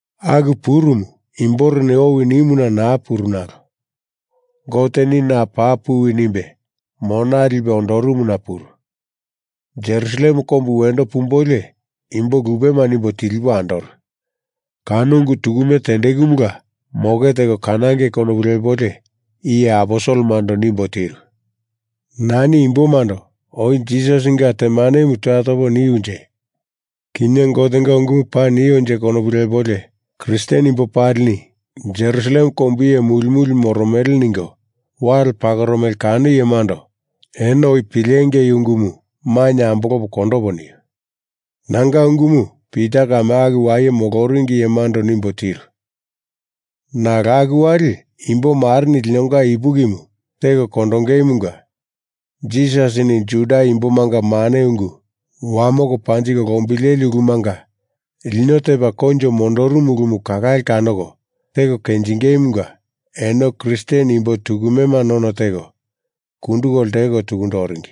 Aku purumu imboreni owi nimuna naa puru nalo Goteni na paa puwi nimbe mona lipe ondorumuna puru. Jerusalem kombu wendo pumbolio imbo lupema nimbo tilipo andoru kano ungu tukume tendekumula moke teko kanangei konopu lepolio iye aposelemando nimbo tiru. Nani imbomando oi Jisasinga temanemu toya topo niunje kinye Gotenga ungumu paa nionje konopu lepolio Kristen imbo palini Jerusalem kombu iye muli muli moromele ningo wale pakoromele kano iyemando eno oi pilengei ungumu mainye ambolopo kondopo niu. Nanga ungumu Pita kame aku waye moloringi iyemando nimbo tiru. Nalo aku wali imbo mareni linonga ipukimu teko kondongeimunga Jisasini Juda imbomanga mane ungu wamoko panjiko lombileli ulumanga lino tepa koinjo mondorumu ulumu kalale kanoko teko kenjingeimunga eno Kristen imbo tukumema none teko kunduko lteko tukundo oringi.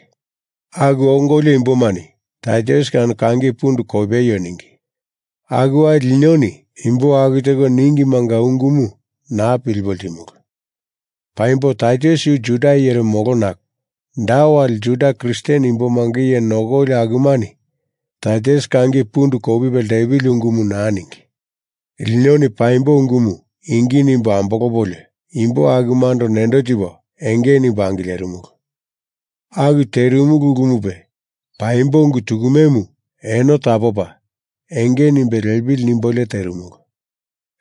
Aku ongolio imbomani Taitus kano kangi pundu kopeio ningi. Aku wali linoni imbo aku teko ningimanga ungumu naa pilipo ltimulu. Paimbo Taitus yu Juda iyere molo nalo da wali Juda Kristen imbomanga iye nokoli akumani Taitus kangi pundu kopipe lepili ungumu naa ningi. Linoni paimbo ungumu ingi nimbo ambolopolio imbo akumando nendo tipo enge nimbo angilerimulu. Aku terimulu ulumupe paimbo ungu tukumemu eno tapopa enge nimbe lepili nimbolio terimulu.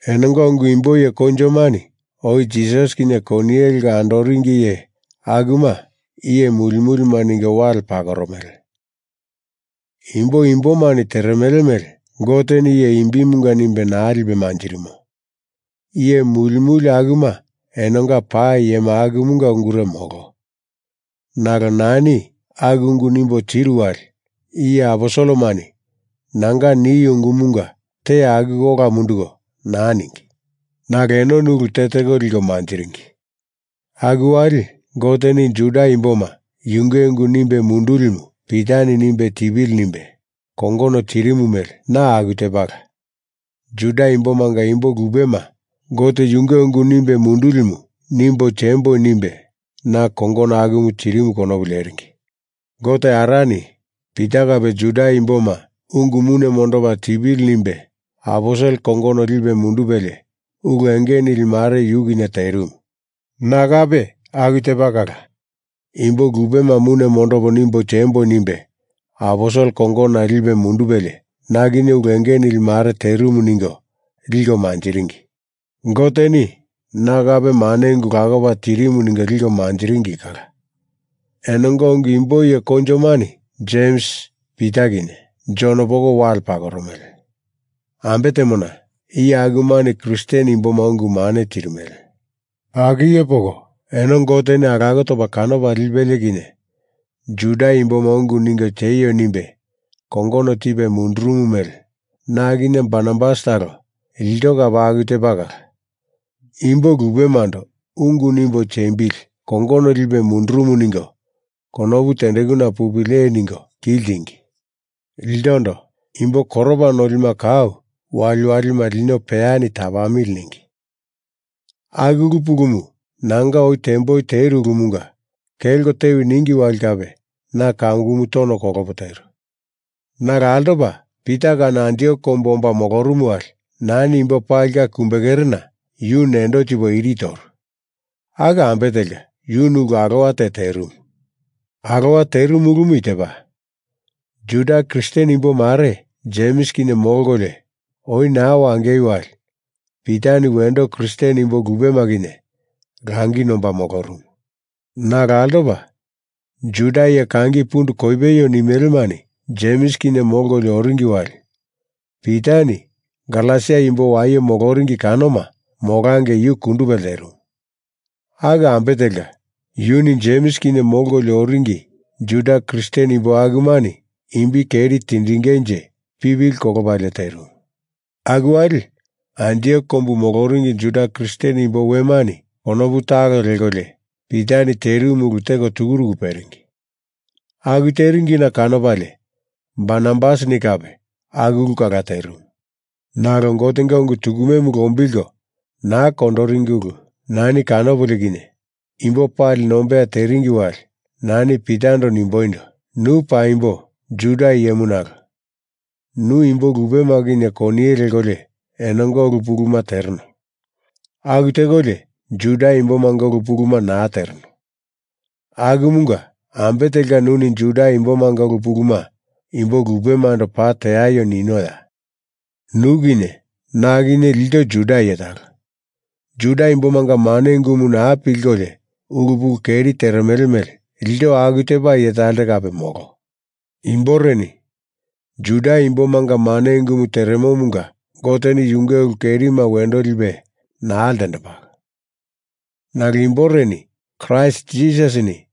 Enonga ungu imbo iye koinjomani oi Jisasi kinye koniye leko andoringi iye akuma iye muli mulima ningo wale pakoromele. Imbo imbomani teremele mele Goteni iye imbimunga nimbe naa lipe manjirimo. Iye muli muli akuma enonga paa iyema akumunga ungure molo. Nalo nani aku ungu nimbo tiru wali iye aposelemani nanga niu ungumunga te akuko ola munduko naa ningi. Nalo enoni ulu teteko liko manjiringi. Aku wali Goteni Juda imboma yunge ungu nimbe mundulimu Pitani nimbe tipili nimbe kongono tirimu mele na aku tepala Juda imbomanga imbo lupema Gote yunge ungu nimbe mundulimu nimbo temboi nimbe na kongono akumu tirimu konopu leringi. Gote Arani Pita kape Juda imboma ungu mune mondopa tipili nimbe aposel kongono lipe mundupelie ulu enge nili mare yu kinye terimu. Na kape aku tepa kala imbo lupema mune mondopo nimbo temboi nimbe aposel kongonona lipe mundupelie na kinye ulu enge nili mare terimu ningo liko manjiringi. Goteni na kape mane ungu lakopa tirimu ningo liko manjiringi kala. Enonga ungu imbo iye koinjomani Jems, Pita kinye Jon poko wale pakoromele. Ambe temona, iye akumani Kristen imboma ungu mane tirimele. Aku iye poko eno Goteni alako topa kanopa lipelie kinye Juda imboma ungu ningo tieio nimbe kongono tipe mundurumu mele na kinye Barnabas talo ilto kape aku tepa kala imbo lupemando ungu nimbo tiembili kongono lipe mundurumu ningo konopu tendekuna pupili ee ningo ki ltingi. Iltondo imbo koropa nolima kau waliwalima lino peyani tapamili ningi. Aku ulu pulumu nanga oi temboi teru ulumunga kelko tewi ningi wali kape na kamukumu tono kolopo teru. Nalo altopa Pita kano Antiok kombu omba molorumu wali nani imbo palinga kumbe kerena yu nendo tipo iri toru. Aku ambe telka yuni ulu alowa te terimu. Alowa terimu ulumu i tepa, Juda Kristen imbo mare Jems kinye molkolio oi naa wangei wali Pitani wendo Kristen imbo lupema kinye langi nomba molorumu. Nalo altopa Juda iye kangi pundu kopeio nimelemani Jems kinye molkolio oringi wali Pitani Galesia imbo waye moloringi kanoma molangei yu kundupe lterimu. Aku ambe telka yuni Jems kinye molkolio oringi Juda Kristen imbo akumani imbi keri tindingenje pipili kolopalie terimu. Aku wali Antiok kombu moloringi Juda Kristen imbo wemani konopu talo lekolio Pitani terimu ulu teko tukuruku peringi. Aku teringina kanopalie Barnabasini kape aku ulu kala terimu. Nalo Gotenga ungu tukumemu lombilko naa kondoringi ulu nani kanopolio kinye imbo pali nombeya teringi wali nani Pitando nimboindo, “Nu paimbo Juda iyemu nalo nu imbo lupema kinye koniye lekolio enonga ulu puluma tereno. Aku tekolio Juda imbomanga ulu puluma naa tereno. Akumunga ambe telka nuni Juda imbomanga ulu puluma imbo lupemando paa teaio ninoya? Nu kinye na kinye ilto Juda iye talo. Juda imbomanga mane ungumu naa pilkolio ulu pulu keri teremele mele ilto aku tepa iye talte kape molo. Imboreni Juda imbomanga mane ungumu teremomunga Goteni yunge ulu kerima wendo lipe naa ltendembalo. Nalo imboreni Kraist Jisasini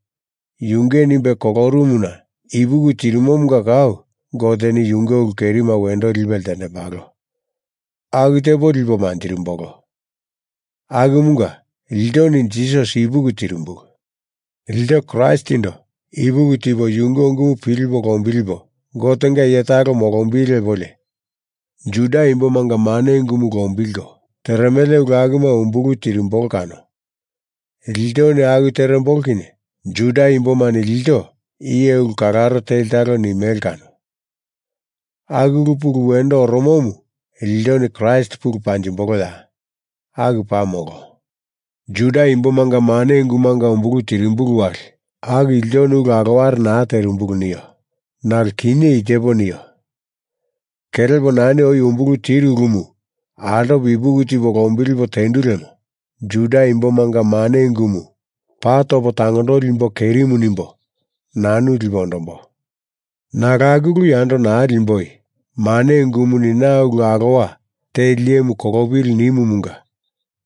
yunge nimbe kolorumuna ipuki tirimomunga kau Goteni yunge ulu kerima wendo lipe ltendembalo aku tepo lipo manjirimbolo. Akumunga iltoni Jisasi ipuki tirimbulu. Ilto Kraistindo ipuki tipo yunge ungumu pilipo lombilipo Gotenga iye talo molombili lepolio Juda imbomanga mane ungumu lombilko teremele ulu akuma umbulu tirimbolo kano. Iltoni aku terembolo kinye Juda imbomani ilto iye ulu kalaro teli talo nimele kano. Aku ulu pulu wendo oromomu iltoni Kraist pulu panjimboloya? Aku paa molo. Juda imbomanga mane ungumunga umbulu tirimbulu wali aku iltoni ulu aloware naa terimbulu, nio. Nalo kinye i tepo nio, kelepo nani oi umbulu tiru ulumu altopo ipuki tipo lombilipo tendu lemo Juda imbomanga mane ungumu paa topo tangondoli imbo kerimu nimbo nanu lipo ondombo. Nalo aku ulu yando naa limboi. mane ungumuni na ulu alowa teli iyemu kolopili nimumunga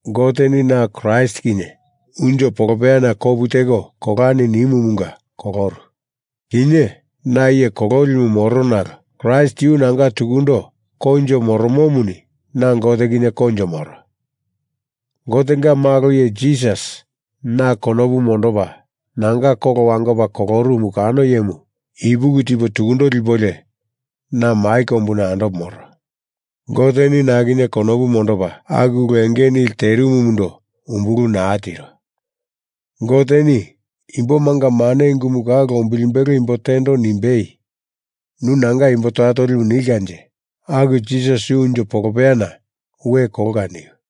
Goteni na Kraist kinye unjo polopeyana kopu teko kolani nimumunga koloru. Kinye na iye kololimu moro nalo Kraist yu nanga tukundo koinjo moromomuni na Gote kinye koinjo moro. Gotenga malo iye Jisasi na konopu mondopa nanga kolo wangopa kolorumu kano iyemu ipuki tipo tukundo lipolio na mai kombuna andopo moro. Goteni na kinye konopu mondopa aku ulu enge nili terimumundo umbulu naa tiro. Goteni imbomanga mane ungumu kau lombilimbelo imbo tendo nimbei nu nanga imbo toya tolimu nilkanje aku Jisasi yu unjo polopeyana we kolka!” niu.